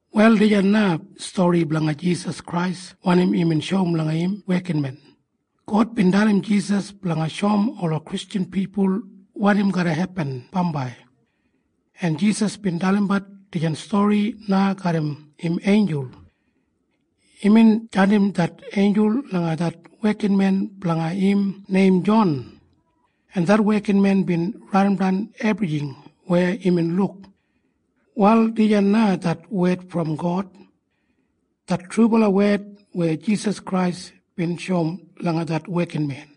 Wal dijan na stori blanga Jisas Krais wanim imbin shoum langa im wekinmen. God bin dalim Jisas blanga shoum ola Kristjan pipul wanim garra hepin bambai, en Jisas bin dalimbat dijan stori na garram im einjul. Imbin jandim det einjul langa det wekinmen blanga im neim Jon, en det wekinmen bin raidimdan ebrijing weya imbin luk. Wal dijan na det wed brom God, det trubala wed weya Jisas Krais bin shoum langa det wekinmen.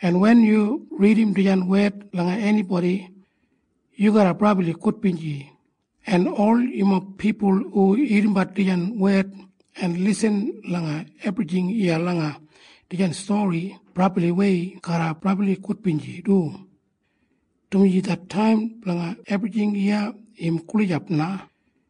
En wen yu ridim dijan wed langa enibodi, yu garra brabli gudbinji. En ol yumob pipul hu irrimbat dijan wed en lisin langa ebrijing iya langa dijan stori brabliwei garra brabli gudbinji du, dumaji det taim blanga ebrijing iya im gulijap na.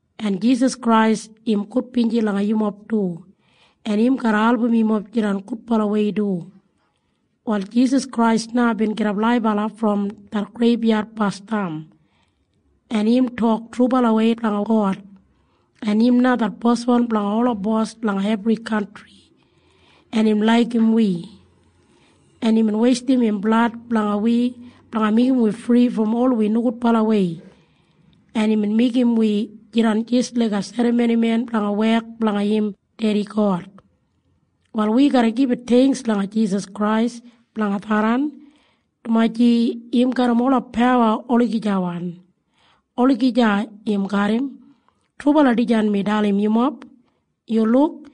En Jisas Krais im gudbinji langa yumob du, en im garra album yumob jidan gudbalawei du. Wal Jisas Krais na bin gidap laibala brom det greibyad basdam. En im tok trubalawei blanga God, en im na det Boswan blanga ola bos langa ebri kantri. En im laigim wi, en imbin weistim im blad blanga wi blanga meigim wi fri brom ol wi nogudbalawei. En imbin meigim wi jidan jis laiga serramonimen blanga wek blanga im Dedi God. Wal wi garra gibit theingks langa Jisas Krais blanga tharran, dumaji im garram ola pawa olagijawan. Olagija im garram. Trubala dijan mi dalim yumob. Yu luk!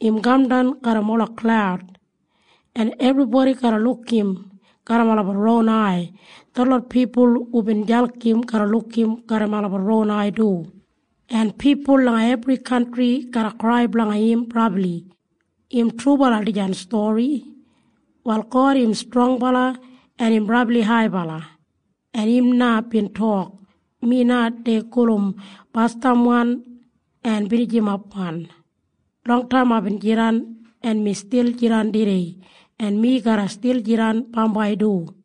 Im kamdan garram ola klaud, en ebribodi garra luk im garram olabat ron ai. Detlot pipul hubin jalk im garra luk im garram olabat ron ai du. En pipul langa ebri kantri garra krai blanga im brabli. Im trubala dijan stori. Wal God im strongbala, en im brabli haibala. En im na bin tok, “Mi na dei gulum Basdamwan en Binijimapwan. Longtaim aibin jidan, en mi stil jidan tudei, en mi garra stil jidan bambai du.”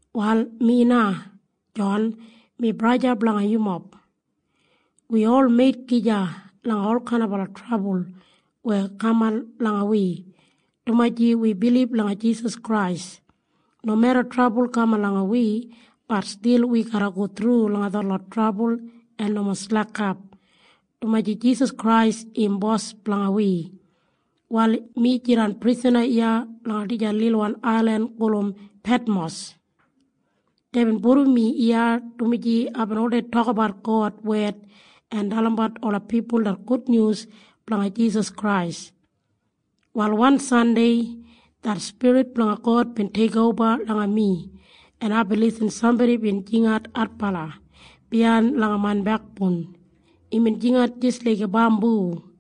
Wal mi na, Jon, mi braja blanga yumob. Wi ol meit gija langa olkain trabul weya kaman langa wi, dumaji wi bilib langa Jisas Krais. Nomeda trabul kaman langa wi, bat stil wi garra go thru langa detlot trabul en nomo slekap, dumaji Jisas Krais im Bos blanga wi. Wal mi jidan prisana iya langa dijan lilwan ailin gulum Petmos. Deibin pudum mi iya, dumaji aibin oldei tokabat God wed en dalimbat ola pipul det gudnyus blanga Jisas Krais. Wal wan Sandei det Spirit blanga God bin teikoba langa mi, en aibin lisin sambodi bin jingat adbala biyain langa main bekboun. Imbin jingat jis laiga bambu,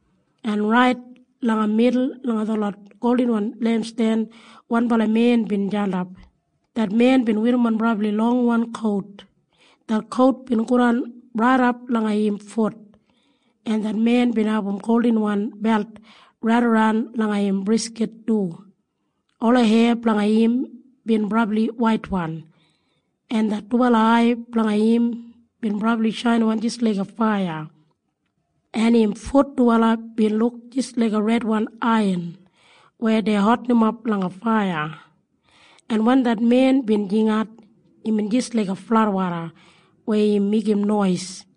en rait langa midul langa detlot goldinwan lempsten wanbala men bin jandap. Det men bin werrimon brabli longwan kout. Det kout bin godan raidap langa im fut, en det men bin abum goldinwan belt raidaran langa im briskit du. Ola heya blanga im bin brabli waitwan, en det dubala ai blanga im bin brabli shainiwan jis laiga faiya, en im fut dubala bin luk jis laiga redwan aiyan weya dei hotinimap langa faiya, en wen det men bin jingat, imbin jis laiga fladwoda weya im meigim nois.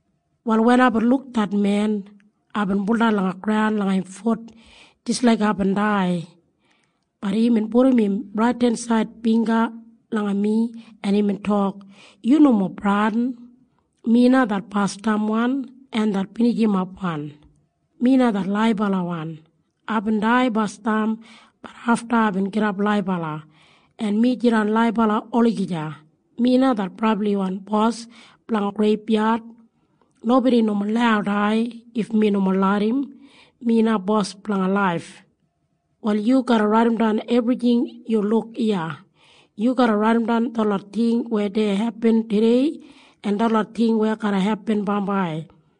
Wal wen aibin luk det men, aibin buldan langa graun langa im fut jis laik aibin dai. Bat imbin pudum im raidensaid bingga langa mi, en imbin tok, “Yu nomo bradin! Mi na det Basdamwan en det Binijimapwan. Mi na det Laibalawan. Aibin dai basdam. Bat afta aibin gidap laibala, en mi jidan laibala olagija. Mi na det brabliwan Bos blanga ola greibyad. Nobodi nomo lau dai if mi nomo larram. Mi na Bos blanga laif. “Wal yu garra raidimdan ebrijing yu luk iya. Yu garra raidimdan detlot ting weya dei hepin tudei en detlot ting weya garra hepin bambai.